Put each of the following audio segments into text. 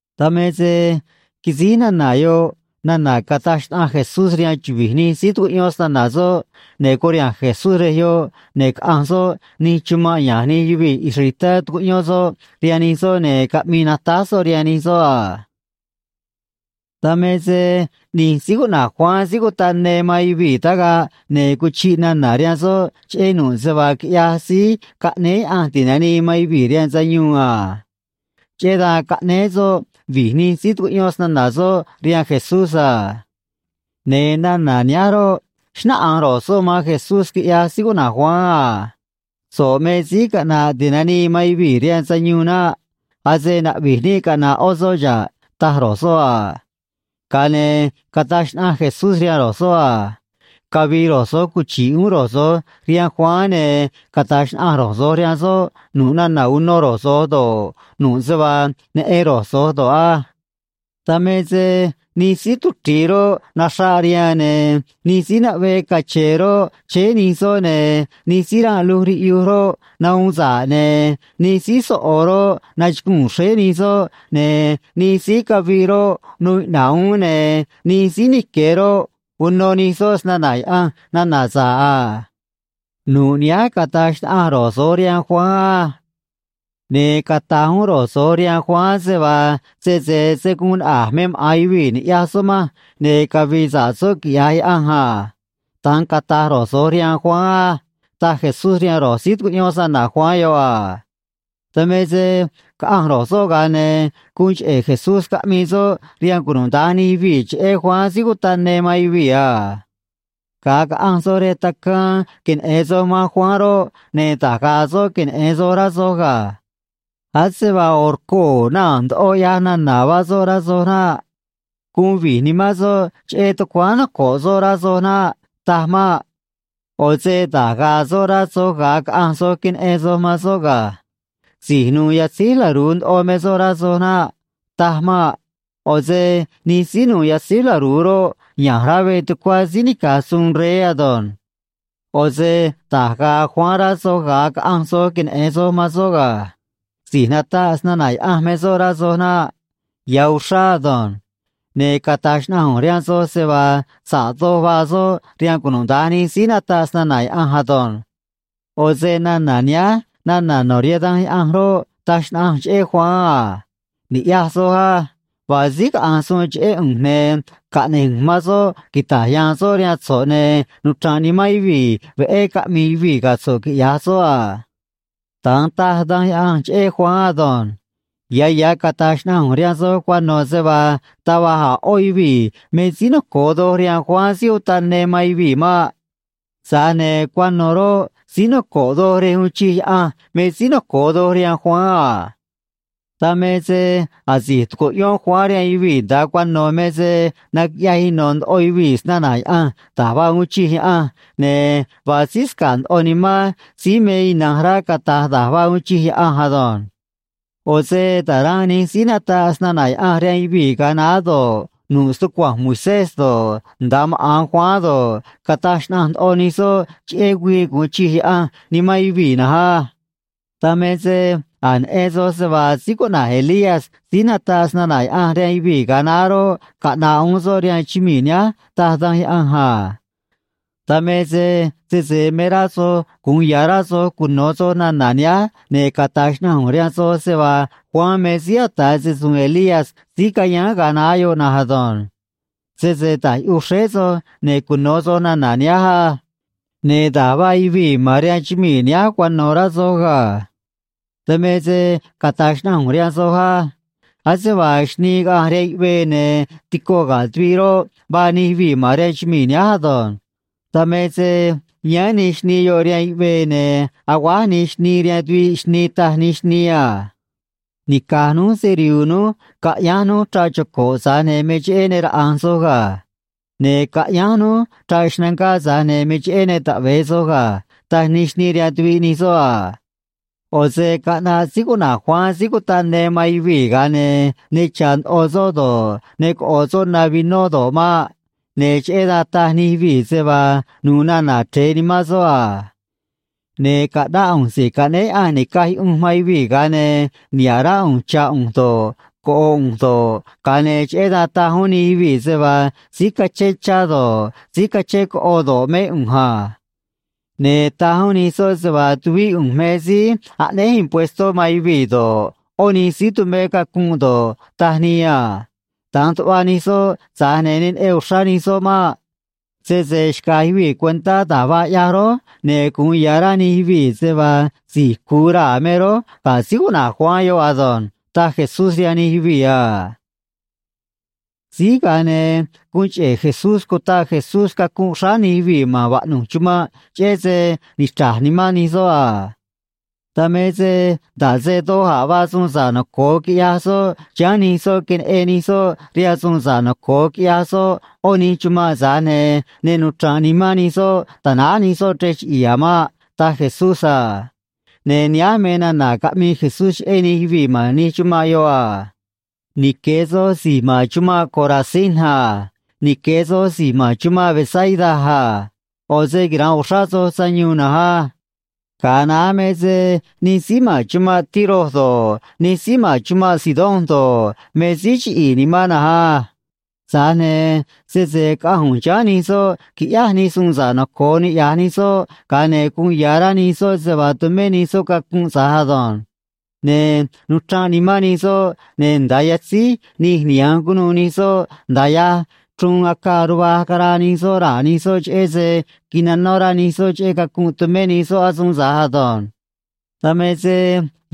Dan me se quisíj nana̱ yoꞌ nana̱ cataj xnaꞌanj Jesús rihaan chuvi̱j nij síí tucuꞌyón snana̱ soꞌ, ne̱ curiha̱nj Jesús rej yoꞌ, ne̱ caꞌanj soꞌ nij chumanꞌ ya̱nj nij yuvii̱ israelitá tu̱cuꞌyón soꞌ rihaan nij soꞌ ne̱ caꞌmi̱i̱ natáj soꞌ rihaan nij soꞌ a. Dan me se ꞌni̱j síí cuꞌna̱j Juan Síí Cutaꞌ Ne man yuvii̱ tagaꞌ, ne̱ cuchiꞌ nana̱ rihaan soꞌ cheꞌé nu̱ꞌ se vaa quiꞌyaj Síí Caꞌnéé Yaꞌanj Ti̱nanii man Yuvii̱ rihaan Sayuun a. Cheꞌé dan caꞌnéé soꞌ vi̱j nij síí tucuꞌyón snana̱ soꞌ rihaan Jesús a. Ne̱ nana̱ nihánj roꞌ, xnáꞌanj ro̱j soꞌ man Jesús, quiꞌyaj síí cuꞌna̱j Juan a: ―So̱ꞌ me Síí Caꞌna̱ꞌ Ti̱nanii man Yuvii̱ rihaan Sayuun naꞌ. Ase na̱ꞌvi̱j níꞌ caꞌna̱ꞌ ꞌó soꞌ xa̱ꞌ ―taj ro̱j soꞌ a. Ga̱a ne̱ cataj xnaꞌanj Jesús rihaan ro̱j soꞌ a: ―Cavi̱i̱ ro̱j so̱j cuchi̱ꞌ uún ro̱j so̱j rihaan Juan, ne̱ cata̱j xnaꞌanj ro̱j so̱j rihaan soꞌ nu̱ꞌ nana̱ uno ro̱j so̱j do̱ꞌ, nu̱ꞌ se vaa neꞌen ro̱j so̱j do̱ꞌ á. Dan me se nij síí tuchri̱i roꞌ, naxraꞌ rihaan, ne̱ nij síí naꞌvee cache̱e̱ roꞌ, chéé nij soꞌ, ne̱ nij síí ranꞌ luj riꞌyuj roꞌ, nahuun sa̱ꞌ, ne̱ nij síí soꞌo̱ roꞌ, nachuguu̱n xréé nij soꞌ, ne̱ nij síí caviꞌ roꞌ, nuu iꞌna̱ꞌ uún, ne̱ nij síí nique̱ roꞌ, uno nij soꞌ snana̱ Yaꞌanj nana̱ sa̱ꞌ a. Nu̱ꞌ nihánj cata̱j xnaꞌanj ro̱j so̱j rihaan Juan á. Ne̱ cata̱j uún ro̱j so̱j rihaan Juan se vaa, sese se̱ guun naꞌa̱j me maꞌa̱n yuvii̱ ni̱ꞌyaj soꞌ manj, ne̱ cavi̱i̱ sa̱ꞌ soꞌ quiꞌya̱j Yaꞌanj a. Da̱nj cata̱j ro̱j so̱j rihaan Juan á ―taj Jesús rihaan ro̱j síí tucuꞌyón snana̱ Juan yoꞌ a. Dan me se caꞌanj ro̱j soꞌ, ga̱a ne̱ guun cheꞌe̱ Jesús caꞌmii soꞌ rihaan cunuda̱nj nij yuvii̱ cheꞌé Juan Síí Cutaꞌ Ne man yuvii̱ a: ―Ga̱a caꞌanj soj rej tacaan queneꞌe̱n soj man Juan roꞌ, ne̱ da̱j ga̱a̱ soꞌ queneꞌe̱n soj, rá soj ga̱. Ase vaa ꞌo̱ rcoo̱ naa̱n ndoꞌo ꞌyaj nana̱ vaa soꞌ, rá soj naꞌ. Guun vi̱j nimán soꞌ cheꞌé tucuáán noco̱ꞌ soꞌ, rá soj naꞌ. Taj maꞌ. ꞌO̱ se da̱j ga̱a̱ soꞌ rá soj, ga̱a caꞌanj soj queneꞌe̱n soj man soꞌ ga̱. Si̱j nu̱u̱ yatzíj laru̱u ndoꞌo me soꞌ, rá soj naꞌ. Taj maꞌ. ꞌO̱ se nij síí nu̱u̱ yatzíj laru̱u roꞌ, ya̱nj rá veꞌ tucuá síí nica̱j suun rey ado̱nj. ꞌO̱ se da̱j ga̱a̱ Juan rá soj, ga̱a caꞌanj soj queneꞌe̱n soj man soꞌ ga̱. Si̱j nataꞌ snana̱ Yaꞌanj me soꞌ, rá soj naꞌ. Ya̱ uxrá ado̱nj. Ne̱ cata̱j xnaꞌanj ꞌu̱nj rihaan soj se vaa sa̱ꞌ doj vaa soꞌ rihaan cunuda̱nj nij síí nataꞌ snana̱ Yaꞌanj ado̱nj. ꞌO̱ se nana̱ nihánj nana̱ no̱ rihaan Danj Yaꞌanj roꞌ, taj xnaꞌanj cheꞌé Juan a: Ni̱ꞌyaj soj á. Vaa síí caꞌa̱nj suun cheꞌé ꞌu̱nj, ne̱ caꞌne̱j ꞌu̱nj man soꞌ quita̱j ya̱a̱n soꞌ rihaan so̱ꞌ, ne̱ nuchra̱nꞌ nimán yuvii̱ veꞌé caꞌmi̱i̱ yuvii̱ ga̱ so̱ꞌ, quiꞌya̱j soꞌ a. Da̱nj taj Danj Yaꞌanj cheꞌé Juan ado̱nj. Ya̱ ya̱ cata̱j xnaꞌanj ꞌu̱nj rihaan soj cuano̱ se vaa taj va̱j a̱ ꞌó yuvii̱ me síí noco̱o doj rihaan Juan Síí Utaꞌ Ne man yuvii̱ maꞌ. Tza̱j ne̱ cuano̱ roꞌ, síí noco̱ꞌ doj rej uun chij Yaꞌanj me síí noco̱o doj rihaan Juan a. ’Dan me se asi̱j tucuꞌyón Juan rihaan yuvii̱ nda̱a cuano̱ me se naquiꞌyaj ino̱ ndoꞌo yuvii̱ snana̱ Yaꞌanj da̱j vaa uun chij Yaꞌanj, ne̱ vaa síí sca̱ꞌ ndoꞌo nimán síí me ina̱nj rá cata̱j da̱j vaa uun chij Yaꞌanj ado̱nj. ꞌO̱ se ta̱ranꞌ nij síí nataꞌ snana̱ Yaꞌanj rihaan yuvii̱ ga̱a naá do̱ꞌ, nu̱ꞌ stucua̱nj Moisés do̱ꞌ, nda̱a maꞌa̱n Juan do̱ꞌ, cataj xnaꞌanj ndoꞌo nij soꞌ cheꞌé güii gu̱un chij Yaꞌanj nimán yuvii̱ na̱nj á. Dan me se a̱j neꞌen soj se vaa síí cuꞌna̱j Elías síí nataꞌ snana̱ Yaꞌanj rihaan yuvii̱ ga̱a naá roꞌ, caꞌna̱ꞌ uún soꞌ rihaan chumii̱ nihánj, taj Danj Yaꞌanj a. Dan me se sese me rá soj gu̱un ya̱ rá soj cuno̱ soj nana̱ nihánj, ne̱ cata̱j xnaꞌanj ꞌu̱nj rihaan soj se vaa Juan me síí ata̱ se‑su̱u̱n Elías síí cayáán ga̱a naá yoꞌ na̱nj ado̱nj. Sese ta̱j yuꞌuj xréé soj, ne̱ cuno̱ soj nana̱ nihánj á. ’Ne̱ da̱j vaa yuvii̱ ma̱n rihaan chumii̱ nihánj cuano̱, rá soj ga̱. Dan me se cata̱j xnaꞌanj ꞌu̱nj rihaan soj á. Ase vaa xnii caꞌanj rihaan yuꞌvee ne̱ tico ga̱ tuviꞌ roꞌ, vaa nij yuvii̱ ma̱n rihaan chumii̱ nihánj ado̱nj. Dan me se yáán nij xnii yoꞌ rihaan yuꞌvee, ne̱ aguáj nij xnii rihaan tuviꞌ xnii, taj nij xnii a: “Nica̱j núj se‑rihu̱u̱ núj, caꞌyánj núj chraꞌ choco̱ꞌ, tza̱j ne̱ me cheꞌé ne raꞌa̱nj soj ga̱. Ne̱ caꞌyánj núj chraꞌ xnangá, tza̱j ne̱ me cheꞌé ne taꞌve̱e soj ga̱”, taj nij xnii rihaan tuviꞌ nij soꞌ a. ꞌO̱ se caꞌnaꞌ síí cuꞌna̱j Juan Síí Cutaꞌ Ne man yuvii̱, ga̱a ne̱ ne cha̱ ndoꞌo soꞌ do̱ꞌ, ne coꞌo̱ soꞌ na vinó do̱ꞌ maꞌ. Ne̱ cheꞌé dan taj nij yuvii̱ se vaa nu̱u̱ nana̱ chre̱e nimán soꞌ a. Ne̱ caꞌnáꞌ ꞌu̱nj Si̱j Caꞌnéé Yaꞌanj Ni̱caj Yuꞌunj man Yuvii̱, ga̱a ne̱ niha̱ꞌ rá ꞌu̱nj chá ꞌu̱nj do̱ꞌ, coꞌo ꞌu̱nj do̱ꞌ, ga̱a ne̱ cheꞌé dan taj uún nij yuvii̱ se vaa síí cachén chá do̱ꞌ, síí cachén coꞌo do̱ꞌ, mé ꞌu̱nj a. Ne̱ taj uún nij soꞌ se vaa tuvíꞌ ꞌu̱nj me síí aꞌnéj impuestó man yuvii̱ do̱ꞌ, ꞌó nij síí tumé cacunꞌ do̱ꞌ, taj nii a. Da̱nj tuꞌva nij soꞌ, tza̱j ne̱ ne neꞌen uxrá nij soꞌ maꞌ. Sese xca̱j yuvii̱ cuentá da̱j vaa ꞌyaj rój, ne̱ gu̱un ya̱ rá nij yuvii̱ se vaa si̱j cu̱u raa̱ me rój ga̱ síí cuꞌna̱j Juan yoꞌ ado̱nj ―taj Jesús rihaan nij yuvii̱ a. Síj, ga̱a ne̱ guun cheꞌe̱ Jesús cutaꞌ Jesús cacunꞌ xráá nij yuvii̱ ma̱n vaꞌnu̱j chumanꞌ cheꞌé se nichra̱j nimán nij soꞌ a. Dan me se nda̱ꞌ se doj a̱ vaa suun sa̱ꞌ noco̱o quiꞌyaj soꞌ chiháán nij soꞌ queneꞌen nij soꞌ rihaan suun sa̱ꞌ noco̱o quiꞌyaj soꞌ ꞌó nij chumanꞌ, tza̱j ne̱ ne nuchra̱nꞌ nimán nij soꞌ ta̱náj nij soꞌ chrej chiꞌi̱i̱ a̱ maꞌ, taj Jesús a. Ne̱ nihánj me nana̱ caꞌmii Jesús cheꞌé nij yuvii̱ ma̱n nij chumanꞌ yoꞌ a: ―Nique̱ soj si̱j ma̱n chumanꞌ Corazín a. Nique̱ soj si̱j ma̱n chumanꞌ Betsaida a. ꞌO̱ se quira̱nꞌ uxrá soj sayuun na̱nj á. Ga̱a naá me se nij síí ma̱n chumanꞌ Tiro do̱ꞌ, nij síí ma̱n chumanꞌ Sidón do̱ꞌ, me síí chiꞌi̱i̱ nimán na̱nj á. Tza̱j ne̱ sese caꞌanj ꞌu̱nj chiháán nij soꞌ quiꞌyáj nij suun sa̱ꞌ noco̱o niꞌya̱j nij soꞌ, ga̱a ne̱ guun ya̱ rá nij soꞌ se vaa tumé nij soꞌ cacunꞌ tza̱j ado̱nj. Ne̱ nuchranꞌ nimán nij soꞌ, ne̱ nda̱a yatzíj nij niha̱nj cunuû nij soꞌ, nda̱a yaj chruun acaa ruvaj caraa nij soꞌ raa̱ nij soꞌ, cheꞌé se quinanó rá nij soꞌ cheꞌé cacunꞌ tumé nij soꞌ asuun tza̱j ado̱nj. Dan me se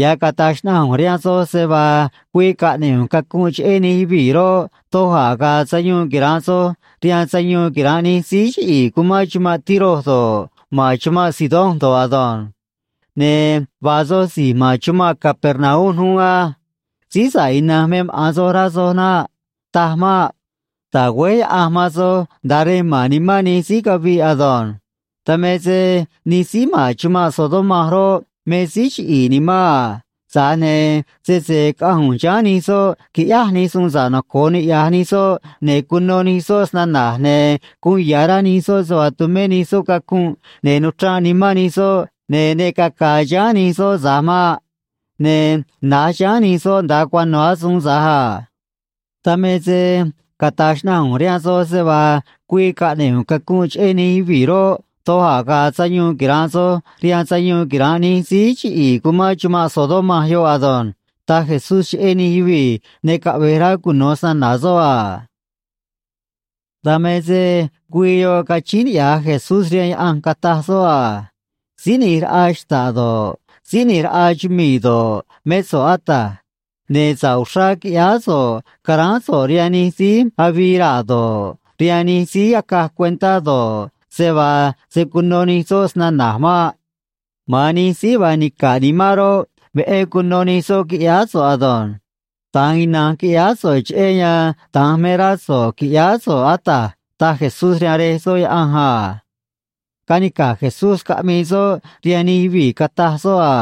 ya̱j cata̱j xnaꞌanj ꞌu̱nj rihaan soj se vaa güii caꞌne̱ꞌ ꞌu̱nj cacunꞌ cheꞌé nij yuvii̱ roꞌ, doj a̱ ga̱a̱ sayuun quira̱nꞌ soj rihaan sayuun quira̱nꞌ nij síí chiꞌi̱i̱ cumán chumanꞌ Tiro do̱ꞌ, ma̱n chumanꞌ Sidón do̱ꞌ ado̱nj. ’Ne̱ vaa soj si̱j ma̱n chumanꞌ Capernaum uún á. Síí sa̱ꞌ ina̱nj me maꞌa̱n soj, rá soj naꞌ. Taj maꞌ. Ta̱güéj Yaꞌanj man soj nda̱a rej ma̱n nimán nij síí caviꞌ ado̱nj. Dan me se nij síí ma̱n chumanꞌ Sodoma roꞌ, me síí chiꞌi̱i̱ nimán a. Tza̱j ne̱ sese caꞌanj ꞌu̱nj chiháán nij soꞌ quiꞌyáj nij suun sa̱ꞌ noco̱o niꞌya̱j nij soꞌ, ne̱ cuno nij soꞌ snana̱j, ne̱ guun ya̱ rá nij soꞌ se vaa tumé nij soꞌ cacunꞌ, ne̱ nuchranꞌ nimán nij soꞌ, ne̱ ne caca̱a̱ chiháán nij soꞌ tza̱j maꞌ. Ne̱ na̱j chiháán nij soꞌ nda̱a cuano̱ asuun tza̱j a. Dan me se cata̱j xnaꞌanj ꞌu̱nj rihaan soj se vaa güii caꞌne̱ꞌ ꞌu̱nj cacunꞌ cheꞌé nij yuvii̱ roꞌ, doj a̱ ga̱a̱ sayuun quira̱nꞌ soj rihaan sayuun quira̱nꞌ nij síí chiꞌi̱i̱ cumán chumanꞌ Sodoma yoꞌ ado̱nj ―taj Jesús cheꞌé nij yuvii̱ ne caꞌve̱j rá cuno̱ snana̱ soꞌ a. Dan me se güii yoꞌ cachíín niꞌya̱j Jesús rihaan Yaꞌanj, cataj soꞌ a: ―Síí ꞌNi̱j Raꞌa xta̱ꞌ do̱ꞌ, Síí ꞌNi̱j Raꞌa chumii̱ do̱ꞌ, mé so̱ꞌ, Ata̱j. Ne̱ sa̱ꞌ uxrá quiꞌyáá so̱ꞌ caráán so̱ꞌ rihaan nij síí avii raa̱ do̱ꞌ, rihaan nij síí acaj cuentá do̱ꞌ, se vaa se̱ cuno nij soꞌ snana̱j maꞌ. Ma̱an nij síí vaa nica̱ꞌ nimán roꞌ, veꞌé cuno nij soꞌ, quiꞌyáá so̱ꞌ ado̱nj. Da̱nj ina̱nj quiꞌyáá so̱ꞌ, cheꞌé yan da̱nj me rá so̱ꞌ qui̱ꞌyáá so̱ꞌ, Ata̱j ―taj Jesús rihaan Rej soꞌ Yaꞌanj a. Canica̱j Jesús caꞌmii soꞌ rihaan nij yuvii̱, cataj soꞌ a: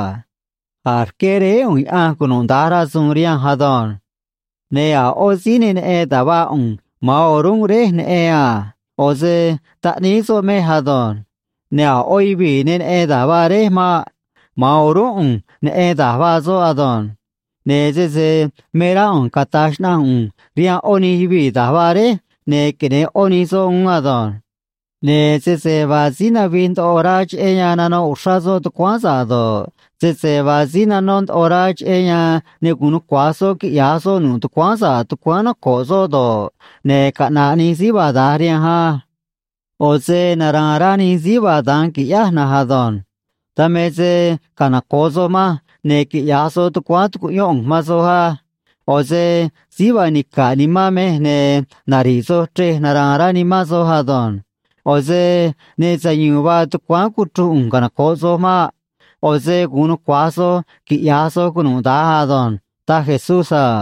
―A̱j rqué Réé ꞌu̱nj Yaꞌanj cunuda̱nj rasu̱u̱n rihanj ado̱nj. Ne̱ a̱ ꞌó síí ne neꞌen da̱j vaa ꞌu̱nj; ma̱an o̱rúnꞌ Réj neꞌen a. ꞌO̱ se Taꞌníí soꞌ mej ado̱nj. Ne̱ a̱ ꞌó yuvii̱ ne neꞌen da̱j vaa Réj maꞌ. Ma̱an o̱rúnꞌ ꞌu̱nj neꞌen da̱j vaa soꞌ ado̱nj. Ne̱ sese me rá ꞌu̱nj cata̱j xnaꞌanj ꞌu̱nj rihaan ꞌó nij yuvii̱ da̱j vaa Réj, ne̱ queneꞌe̱n ꞌó nij soꞌ uún ado̱nj. Ne̱ sese vaa síí navij ndoꞌo rá cheꞌé yan nanoꞌ uxrá soꞌ tucuáán sa̱ꞌ do̱ꞌ, sese vaa síí nanó ndoꞌo rá cheꞌé yan ne gu̱un nucua̱j soꞌ quiꞌya̱j soꞌ nu̱ꞌ tucuáán sa̱ꞌ tucuáán noco̱ꞌ soꞌ do̱ꞌ, ne̱ caꞌna̱ꞌ nij síí vaa da̱nj rihanj á. ꞌO̱ se nara̱a̱n rá nij síí vaa da̱nj, qui̱ꞌyáj na̱nj ado̱nj. Dan me se canoco̱ꞌ soj manj, ne̱ quiꞌya̱j soj tucuáán tu̱cuꞌyón ꞌu̱nj man soj á. ꞌO̱ se síí vaa nica̱ꞌ nimán mej, ne̱ nari̱ꞌ soj chrej nara̱a̱n rá nimán soj ado̱nj. ꞌO̱ se ne sayu̱u̱n vaa tucuáán cuchruj ꞌu̱nj canoco̱ꞌ soj maꞌ. ꞌO̱ se gu̱un nucua̱j soj quiꞌya̱j soj cunuda̱nj ado̱nj ―taj Jesús a.